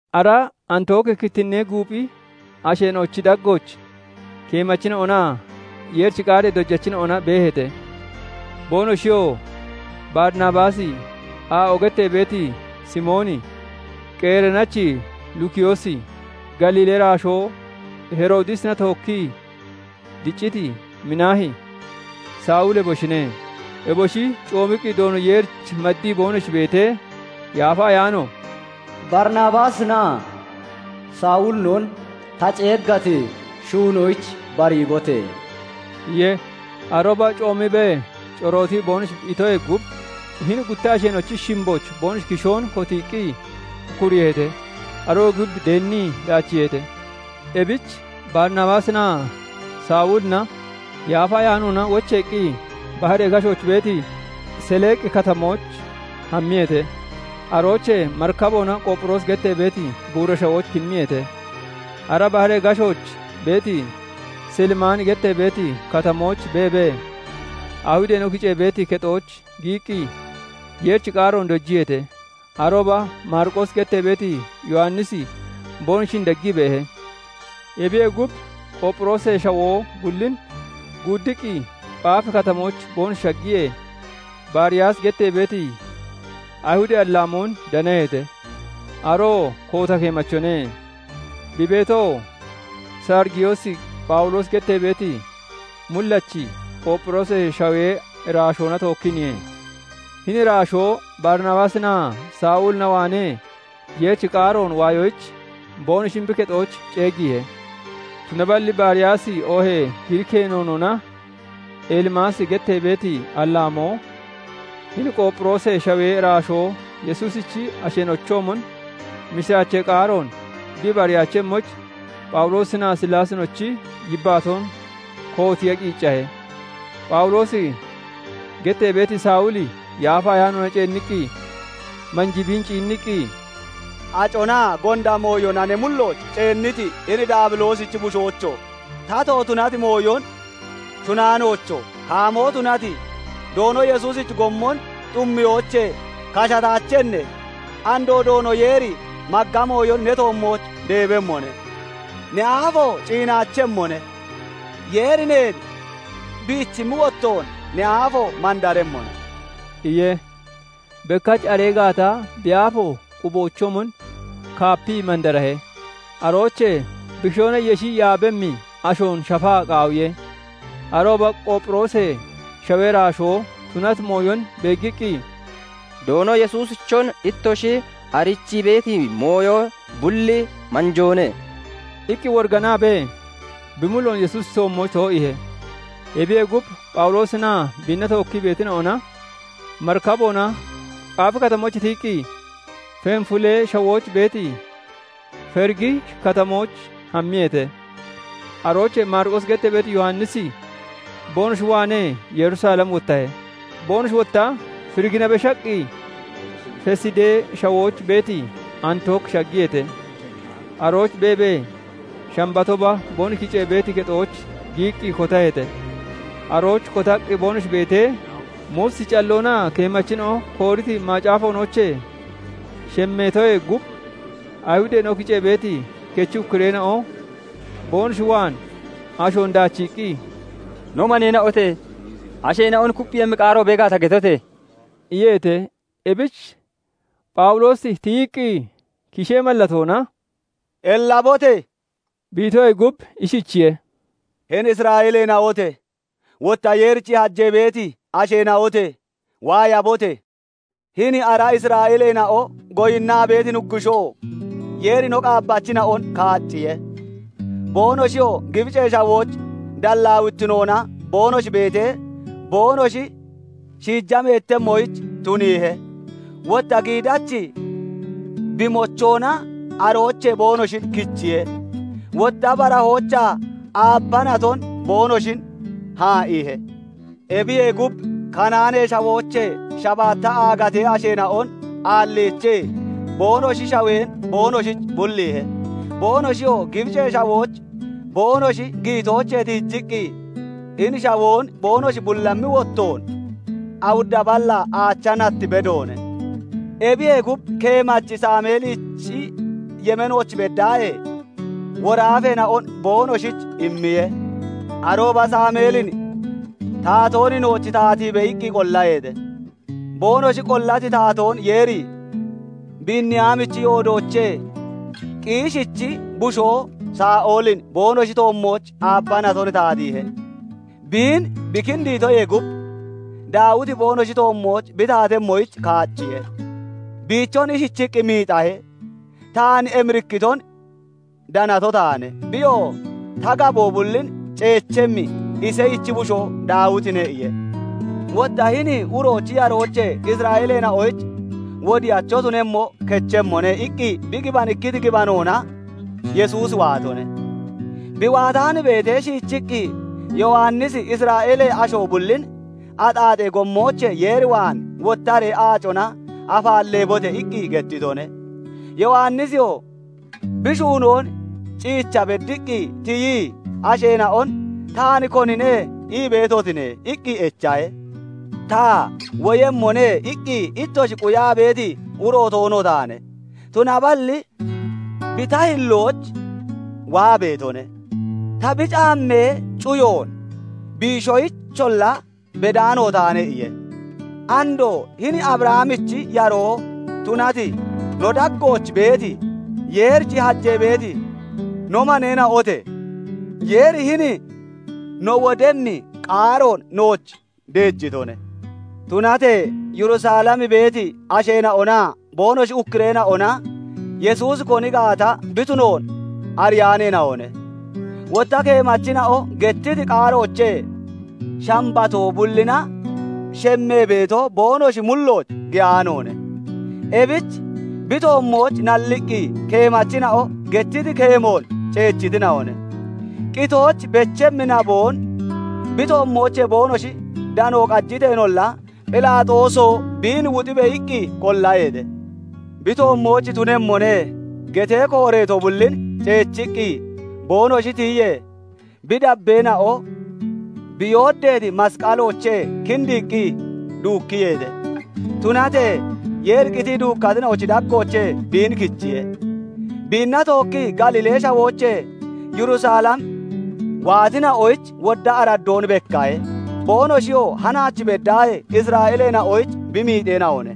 Ara Antooki kittinnee guuphi asheena'ochi daggooch keemachina'onaa Yeerichi qaaree dojachina'ona beeheete. Boonoshiyoo Barinabaasi, aa'o gettee beeti Simooni, Qereenachi Lukiyoosi, Galiilee iraashoo Heroodisina tookkii dicciti Minaahi, Sawuli eboshine. Eboshi coomiqqi Doono Yeerich maddii boonoshi beetee, Yaafa Ayaano "Barinabaasinaa Sawulinon ta ceeggati shuunoyich bariibote!" iye. Arooba coomiibee corootii boonoshi itoyee gub, hini gutta asheena'ochi shimbooch boonoshi kishoon kotiiqqi ukkuriiheete. Aroyee gub deennii daachiiheete. Ebich Barinabaasinaa Sawulina Yaafa Ayaanoona wocheeqqi baharee gashooch beeti Seleeqi Katamooch hammiyeete. Aroochee marikaboona Qoopphiroosi gettee beeti buura shawooch kimmiyeete. Ara baharee gashooch beeti Silimaani gettee beeti katamooch beebee, Ayihudeena'o kicee beeti kexooch giyiqqi, Yeerichi qaaroon dojiyeete. Arooba Maariqoosi gettee beeti Yowannisi boonoshin deggii beehe. Ebiyee gub, Qoopphiroosee Shawoo bullin guuddiqqi, Phaafi Katamooch boonoshi shaggiyee, Bariyaasi gettee beeti Ayihudee allaamoon danaheete; aroo koota keemachone. Bi beetoo, Sarigiyoos Phawuloosi gettee beeti mullachi, Qoopphiroosee Shawee iraashoona tookkiiniye. Hini iraashoo Barinabaasinaa Sawulina waanee Yeerichi qaaroon waayoyich boonoshin bi kexooch ceeggiihe. Tunaballi Bariyaasi, oohee Giriikee noonoona Elimaasi gettee beeti allaamoo, hini Qoopphiroosee Shawee iraashoo Yesuusichi asheena'ochoomon mishiraachee qaaroon bi ibariyaachemmoyich, Phawuloosinaa Sillaasinochi yibbaatoon kootiiya qiiccahe. Phawuloosi gettee beeti Sawuli Yaafa Ayaanoona ceenniqqi manjii biin ciinniqqi, "Aconaa gonda mooyona ne mullooch ceenniti hini Daabiloosichi bushoocho! Tato tunati mooyon shunaanoocho! Kaamoo tunati, Doono Yesuusichi gommon xummiyoochee kashataachenne? Andoo Doono Yeeri magga mooyon ne toommooch deebemmone; ne aafo ciinaachemmone; Yeeri neen biichimmi wottoon ne aafo mandaremmone" iye. Bekkach aree gaata bi aafo quboochoomon kaapii mandarahe; aroochee bi kishoona yeshi yaabemmi ashoon shafaa qaawiye. Arooba Qoopphiroosee Shawee iraashoo tunati mooyon beeggiqqi, "Doono Yesuusichon ittoshi arichii beeti mooyo bulli manjoone" iqqi woriganaabee bi mulloon Yesuusichi toommooch too'iihe. Ebiyee gub, Phawuloosinaa biinna tookkii beetina'ona marikaboona, Phaafi Katamoochee tiyiqqi, Fenfulee Shawooch beeti Ferigi Katamooch hammiyeete. Aroochee Maariqoosi gettee beeti Yowannisi boonoshi waanee Yerusalem wottahe. Boonoshi wotta Ferigina beshaqqi, Fesidee Shawooch beeti Antook shaggiyeete. Arooch beebee, Shambatooba boonoshi kicee beeti kexooch giyiqqi kotaheete. Arooch kotaqqi boonoshi beetee, Muusichi calloonaa keemachina'o kooriti macaafoonoochee shemmeetoyee gub, Ayihudeena'o kicee beeti kechi ukkureena'o boonoshi waan ashoon daachiiqqi, "No maneena'ote! Asheena'on kupphiiyemmi qaaro bee gaata, getote!" iyeete. Ebich Phawuloosi tiyiqqi kishee mallatoona "Ellabote!" bi itoyee gub, ishichiye:- "Hini Isra'eeleena'ote! Wotta Yeerich hajee beeti asheena'ote! Waayabote! Hini ara Isra'eeleena'o goyinnaa beeti Nuggushoo Yeeri no qaabbachina'on kaacciye. Boonoshiyoo Gibicee Shawooch dallaawittinoona boonoshi beetee, boonoshi shiija meettemmoyich tuniihe; wotta giidachi bi mochoona aroochee boonoshin kichiye. Wotta barahoochaa aabba naton boonoshin haa'iihe. Ebiyee gub, Kanaanee Shawoochee shabaatta aagatee asheena'on aalliichii, boonoshi shawoon boonoshich bulliihe. Boonoshiyoo Gibicee Shawooch boonoshi giyitoochee tiijiqqi, hini shawoon boonoshi bullammi wottoon awudda ballaa aacha nat bedoone. "Ebiyee gub, keemachi Saameelichi yemeenooch beddaahee, woraafeena'on boonoshich immiye. Arooba Saameelin 'Taatoon nooch taatiibe!' iqqi qollaheete. Boonoshi qollati taatoon Yeeri Biiniyaamichi yoodoochee Qiishichi bushoo Saa'olin boonoshi toommooch aabba naton taatiihe. Biin bi kindiitoyee gub, Daawiti boonoshi toommooch bi taatemmoyich kaacciye. Biichon ishichiqqi miixahe:- 'Taan emirikkiton danato taane; Biyoo ta gaboo bullin ceechemmi, Iseyichi bushoo Daawitine' iye. Wotta 'Hini uroochi yaroochee Isra'eeleena'oyich wodiyacho tunemmo kechemmone' iqqi bi gibanikkiti gibanoona Yesuusi waatone. Bi waataan beetee, shiichiqqi, Yowannisi Isra'eelee asho bullin 'Axaaxee gommoochee Yeer waan wottaree aacona afaalleebote!' iqqi gettitone. Yowannisiyoo bi shuunoon ciicha beddiqqi tiyii asheena'on 'Taan konine ii beetotine?' iqqi echahe. 'Ta "Woyemmone" iqqi ittoshi quyaa beeti uro toono taane. Tunaballi bi ta hillooch waa beetone; ta bi caammee cuyoon biishoyicholla bedaano taane' iye. "Andoo hini Abrahamichi yaroo tunati, no daggooch beeti, Yeerich hajee beeti no maneena'onote! Yeeri hini no wodemmi qaaroon nooch deejitone. Tunatee Yerusalem beeti asheena'onaa boonoshi ukkureena'ona Yesuusi koni gaata bi tunoon ariyaaneena'one; wotta keemachina'o gettiti qaaroochee Shambatoo bullina shemmee beeto boonoshi mullooch giyaanoone. Ebich bi toommooch nalliqqi, keemachina'o gettiti keemoon ceechitina'one. Qitooch bechimmi naboon bi toommoochee boonoshi dano qajiteenolla, 'Phelaaxooso! Biin wuxibe!' iqqi qollaheete. 'Bi toommooch tunemmone' getee kooreeto bullin ciichiqqi boonoshi tiyiyee, bi dabbeena'o bi yooddeeti masqaloochee kindiiqqi duukkiyeete. Tunatee Yeeri qitii duukkatina'ochi daggoochee biin kichiye. Biinna tookkii Galiilee Shawoochee Yerusalem waatina'oyich wodda araddoon bekkahe. Boonoshiyoo [hanaach beddaahee] Isra'eeleena'oyich bi miixeena'one.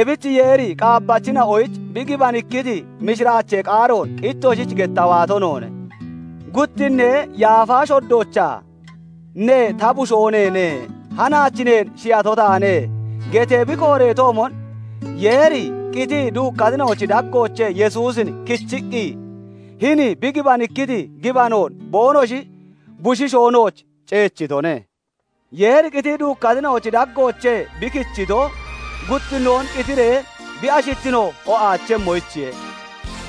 Ebich Yeeri qaabbachina'oyich bi gibanikkiti mishiraachee qaaroon ittoshich getta waato noone. Guttinnee yaafa shoddoochaa 'Ne ta bushoo neene; Hanaach neen shiyato taane' getee bi kooreetoomon, Yeeri qitii duukkatina'ochi daggoochee Yesuusin kichiqqi, hini bi gibanikkiti gibanoon boonoshi bushiishoo nooch ceechitone. Yeeri qitii duukkatina'ochi daggoochee bi kichito, guttinnoon qitiree bi ashittino o'aachemmoyichiye.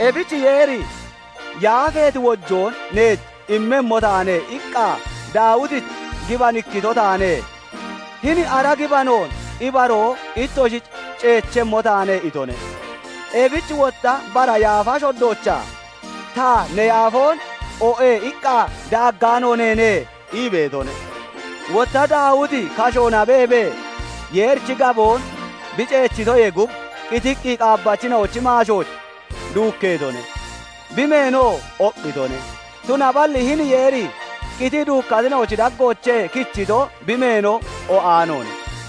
Ebich Yeeri ' "Yaafeeti wojoon neech immemmo taane" iqqaa Daawitich gibanikkito taane; Hini ara gibanoon ibaroo ittoshich ceechemmo taane' itone. Ebich wotta bara yaafa shoddoochaa 'Ta ne yaafoon "o'e" iqqa daaggaano neene' ii beetone. Wotta Daawiti kashoona beebee Yeerichi gaboon bi ceechitoyee gub, qitiqqi qaabbachina'ochi maashooch duukkeetone; bi meenoo oqqitone. Tunaballi hini Yeeri qitii duukkatina'ochi daggoochee kichito bi meeno o'aanoone.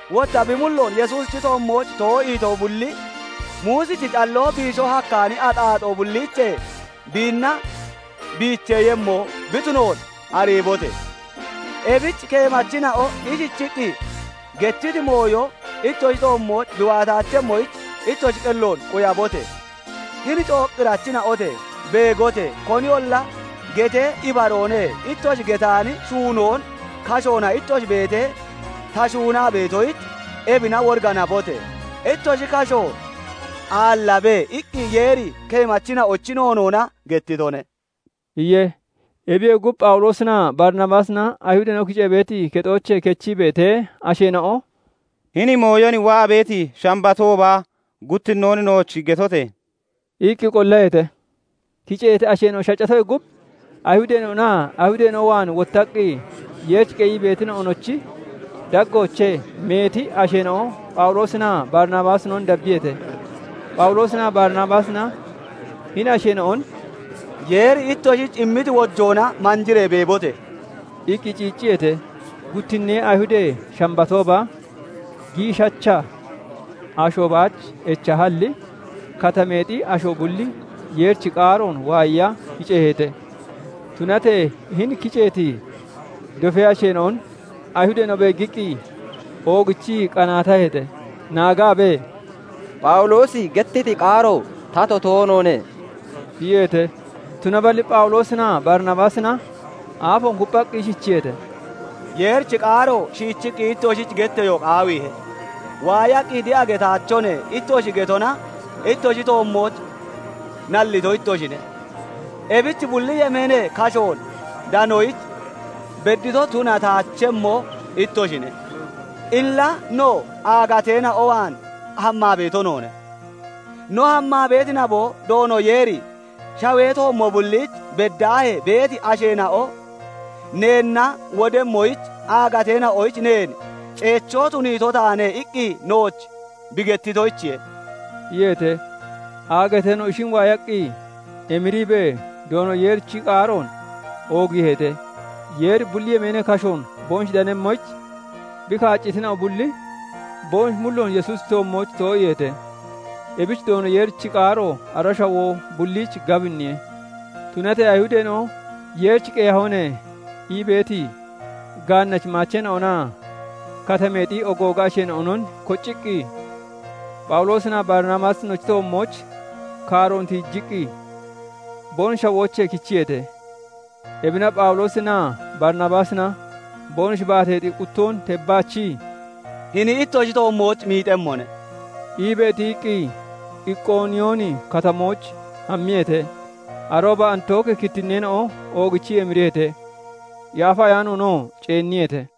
Wotta bi mulloon Yesuusichi toommooch too'iito bulli, Muusichi calloo biisho hakkaani axaaxoo bulliichee biinna biicheeyemmo bi tunoon ariibote! Ebich keemachina'o ishichiqqi gettiti mooyo ittoshi toommooch bi waataachemmoyich ittoshi qelloon quyabote! 'Hini cooqqirachina'ote! Beegote! Koniyolla getee, "Ibaroone" ittoshi getaani shuunoon Kashoona ittoshi beetee ta shuunaa beetoyich, Ebina woriganabote! Ittoshi kasho aallabe!' iqqi Yeeri keemachina'ochi noonoona gettitone" iye. Ebiyee gub, Phawuloosinaa Barinabaasina Ayihudeena'o kicee beeti kexoochee kechii beetee, asheena'o "Hini mooyon waa beeti Shambatooba guttinnoon nooch gettote!" iqqi qollaheete. Kiceeti asho shaccatoyee gub, Ayihudeena'onaa Ayihudeena'o waan wottaqqi Yeerich qeyii beetina'onochi daggoochee meeti asheena'o Phawuloosinaa Barinabaasinon dabbiyeete. Phawuloosinaa Barinabaasina hini asheena'on "Yeeri ittoshich immiti wojoona manjiree beebote!" iqqi ciicciyeete. Guttinnee Ayihudee Shambatooba giishacaha asho baach echahalli, katameexi asho bulli Yeerichi qaaroon waayiya kiceeheete. Tunatee hini kiceeti dofee asheena'on Ayihudeena'o beeggiqqi oogichii qanaataheete; naagaabee, "Phawuloosi gettiti qaaro tato toonoone" iyeete. Tunaballi Phawuloosinaa Barinabaasina aafoon kupphaqqi ishichiyeete:- "Yeerichi qaaro shiichii ittoshich getteyo qaawiihe. 'Waayaqqi de'a getaachone' ittoshi getona ittoshi toommooch nallito ittoshine; ebich bulli yemeenee kashoon danoyich beddito tunataachemmo ittoshine. Illa no, aagateena'o waan hammaa beeto noone. No hammaa beeti naboo, Doono Yeeri 'Shawee toommo bulliich beddaahee beeti asheena'o neenna wodemmoyich, Aagateena'oyich neen ceechoo tuniito taane' iqqi nooch bi gettitoyichiye" iyeete. Aagateena'o ishin waayaqqi, emiriibee Doono Yeerichi qaaroon oogiiheete. Yeeri bulli yemeenee kashoon boonoshi danemmoyich, bi kaaccitina'o bulli boonoshi mulloon Yesuusichi toommooch too'iiheete. Ebich Doono Yeerichi qaaro ara shawoo bulliich gabinniye. Tunatee Ayihudeena'o "Yeerich qeyahone" ii beeti gaannachi maacheena'onaa Katameexi ogooga asheena'onon kocciqqi, Phawuloosinaa Barinabaasinochi toommooch kaaroon tiijiqqi, boonoshi shawoochee kichiyeete. Ebina Phawuloosinaa Barinabaasina boonoshi baateexi quttoon tebbaachii, "Hini ittoshi toommooch miixemmone" iibee tiyiqqi, Iqooniyooni Katamooch hammiyeete. Arooba Antooki kittinneena'o oogichii emiriyeete; Yaafa Ayaanoonoo ceenniyeete.